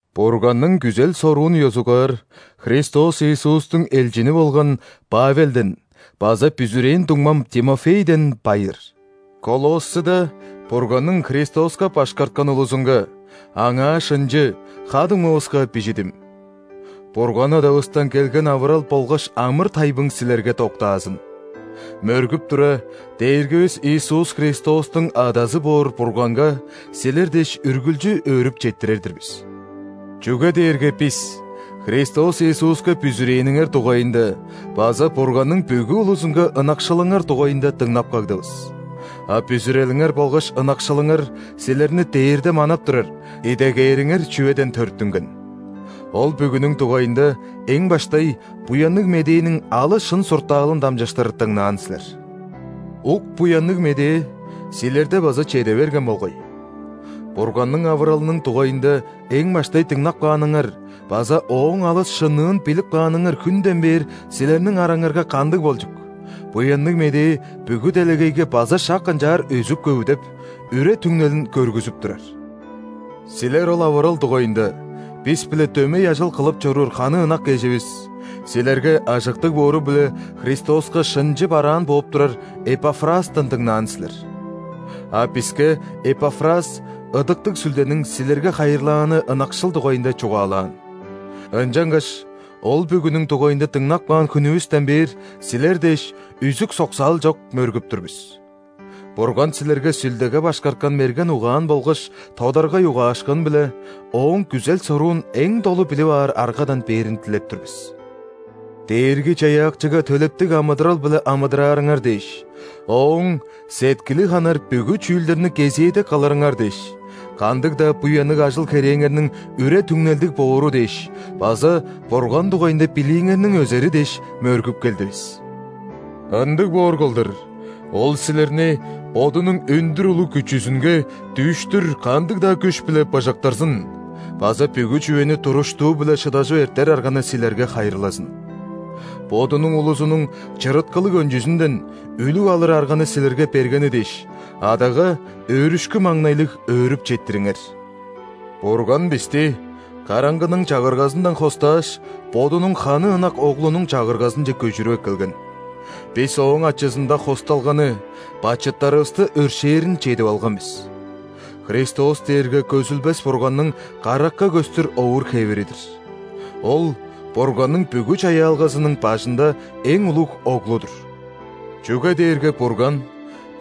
Бурганның күзел-соруун ёзугаар Христос Иисустуң элчини болган Павелден база бүзүрээн дуңмам Тимофейден байыр. Колоссыда Бурганның Христоска башкарткан улузунга, Аңаа шынчы ха-дуңмавыска бижидим. Бурган Адавыстан келген авырал болгаш амыр-тайбың силерге доктаазын! Мөргүп тура, Дээргивис Иисус Христостуң Адазы боор Бурганга силер дээш үргүлчү өөрүп четтирер-дир бис. Чүге дээрге бис Христос Иисуска бүзүрээниңер дугайында база Бурганның бүгү улузунга ынакшылыңар дугайында дыңнап кагдывыс. А бүзүрелиңер болгаш ынакшылыңар силерни дээрде манап турар, идегээриңер чүведен төрүттүнген. Ол бүгүнүң дугайында эң баштай Буянныг Медээниң алыс шын суртаалын дамчыштыр дыңнаан силер. Ук Буянныг Медээ силерде база чеде берген болгай. Бурганның авыралының дугайында эң баштай дыңнап кааныңар база ооң алыс шынныын билип кааныңар хүнден бээр силерниң араңарга кандыг болчук, Буянныг Медээ бүгү делегейге база шак ынчаар өзүп-көвүдеп, үре-түңнелин көргүзүп турар. Силер ол авырал дугайында бис-биле дөмей ажыл кылып чоруур ханы ынак эживис, силерге ажыктыг боору-биле Христоска шынчы бараан бооп турар Эпафрастан дыңнаан силер. А биске Эпафрас Ыдыктыг Сүлдениң силерге хайырлааны ынакшыл дугайында чугаалаан. Ынчангаш ол бүгүнүң дугайында дыңнап каан хүнүвүстен бээр силер дээш үзүк-соксаал чок мөргүп тур бис. Бурган силерге Сүлдеге башкарткан мерген угаан болгаш тодаргай угаашкын-биле Ооң күзел-соруун эң долу билип аар аргадан бээрин дилеп тур бис. Дээрги-Чаяакчыга төлептиг амыдырал-биле амыдыраарыңар дээш; Ооң сеткили ханар бүгү чүүлдерни кезээде кылырыңар дээш; кандыг-даа буянныг ажыл-херээңерниң үре-түңнелдиг боору дээш база Бурган дугайында билииңерниң өзери дээш, мөргүп келдивис. Ындыг боор кылдыр, Ол силерни Бодунуң өндүр улуг күчүзүнге дүүштүр кандыг-даа күш-биле быжыктырзын база бүгү чүвени туруштуу-биле шыдажып эртер арганы силерге хайырлазын. Бодунуң улузунуң чырыткылыг өнчүзүнден үлүг алыр арганы силерге бергени дээш, Адага өөрүшкү-маңнайлыг өөрүп четтириңер. Бурган бисти караңгының чагыргазындан хостааш, Бодунуң ханы ынак Оглунуң Чагыргазынче көжүрүп эккелген. Бис Ооң ачызында хосталганы – бачыттарывысты өршээрин чедип алган бис. Христос дээрге көзүлбес Бурганның каракка көстүр овур-хевири-дир.Ол – Бурганның бүгү чаяалгазының бажында эң улуг Оглу-дур. Чүге дээрге Бурган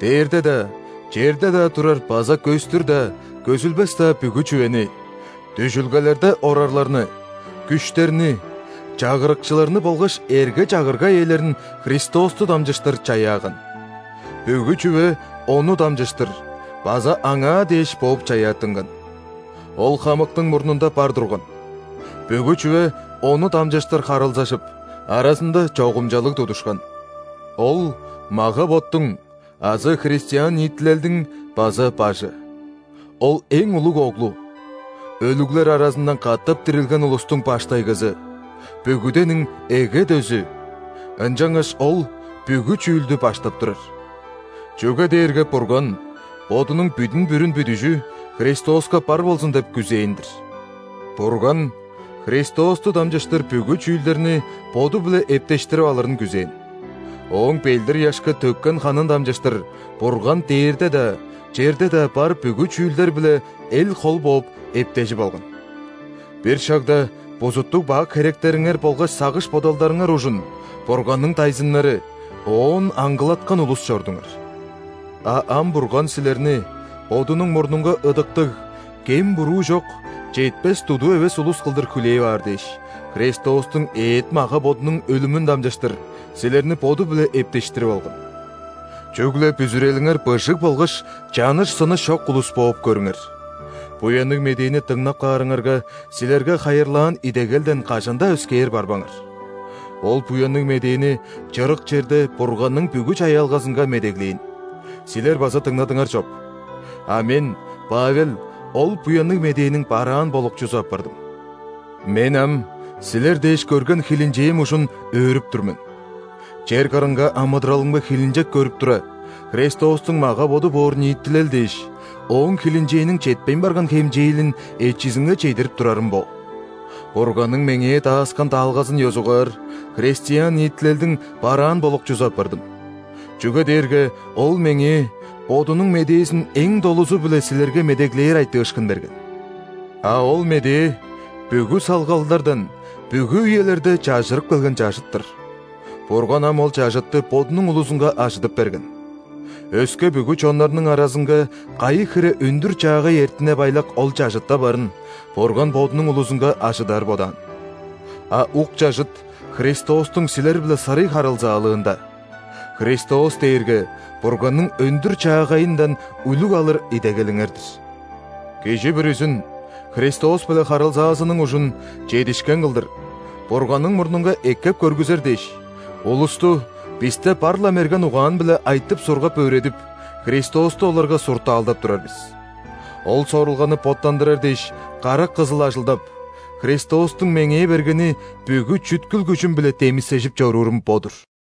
дээрде-даа, черде-даа турар базакөстүр-даа, көзүлбес-даа бүгү чүвени:дүжүлгелерде орарларны, күштерни, чагырыкчыларны болгашэрге-чагырга ээлерин Христосту дамчыштыр чаяаган.Бүгү чүве Ону дамчыштыр база Аңаа дээш бооп чаяаттынган. Ол хамыктың мурнунда бар турган,бүгү чүве Ону дамчыштыр харылзажып, аразында чогумчалыг тудушкан. Ол мага-боттуң (азы христиан ниитилелдиң) база Бажы.Ол – эң улуг Оглу, өлүглер аразындан катап дирилген улустуң баштайгызы,бүгүдениң эге дөзү, ынчангаш Ол бүгү чүүлдү баштап турар. Чүге дээрге Бурган Бодунуң бүдүн-бүрүн бүдүжүХристоска бар болзун деп күзээн-дир. Бурган Христосту дамчыштыр бүгү чүүлдерниБоду-биле эптештирип алырын күзээн.Ооң ·белдир-ыяшка төккен ханын дамчыштырБурган дээрде-даа, черде-даа бар бүгү чүүлдер-биле эл-хол бооп, эптежип алган. Бир шагда бузуттуг-бак херектериңер болгаш сагыш-бодалдарыңар ужун Бурганның дайзыннары, Оон аңгылаткан улус чордуңар. А ам Бурган силерни Бодунуң мурнунга ыдыктыг, кем-буруу чок, четпес-дудуу эвес улус кылдыр хүлээп аар дээш, Христостуң эът-мага-бодунуң өлүмүн дамчыштыр силерни Боду-биле эптештирип алган. Чүгле бүзүрелиңер быжыг болгаш чаныш-сыныш чок улус бооп көрүңер, Буянныг Медээни дыңнап каарыңарга, силерге хайырлаан идегелден кажан-даа өскээр барбаңар. Ол Буянныг Медээни чырык черде Бурганның бүгү чаяалгазынга медеглээн, силер база дыңнадыңар чоп. А мен, Павел, ол Буянныг Медээниң бараан болукчузу апардым. Мен ам силер дээш көрген хилинчээм ужун өөрүп тур мен. Чер кырынга амыдыралымга хилинчек көрүп тура, Христостуң мага-боду боор ниитилел дээш Ооң хилинчээниң четпейн барган хемчээлин эчизинге чедирип турарым бо. Бурганның меңээ дааскан даалгазын ёзугаар, христиан ниитилелдиң бараан болукчузу апардым, чүге дээрге Ол меңээ Бодунуң медээзин эң долузу-биле силерге медеглээр айтыышкын берген. А ол медээ – бүгү салгалдардан бүгү үелерде чажырып келген чажыт-тыр. Бурган ам ол чажытты Бодунуң улузунга ажыдып берген. Өске бүгү чоннарның аразынга кайы хире өндүр-чаагай эртине-байлак ол чажытта барын Бурган Бодунуң улузунга ажыдар бодаан. А ук чажыт – Христостуң силер-биле сырый харылзаалыында. Христос дээрге Бурганның өндүр-чаагайындан үлүг алыр идегелиңер-дир. Кижи бүрүзүн Христос-биле харылзаазының ужун чедишкен кылдыр Бурганның мурнунга эккеп көргүзер дээш, улусту бисте бар-ла мерген угаан-биле айтып-сургап, өөредип, Христосту оларга суртаалдап турар бис. Ол сорулганы боттандырар дээш карак кызыл ажылдап, Христостуң меңээ бергени бүгү чүткүл-күжүм-биле демисежип чоруурум бо-дур.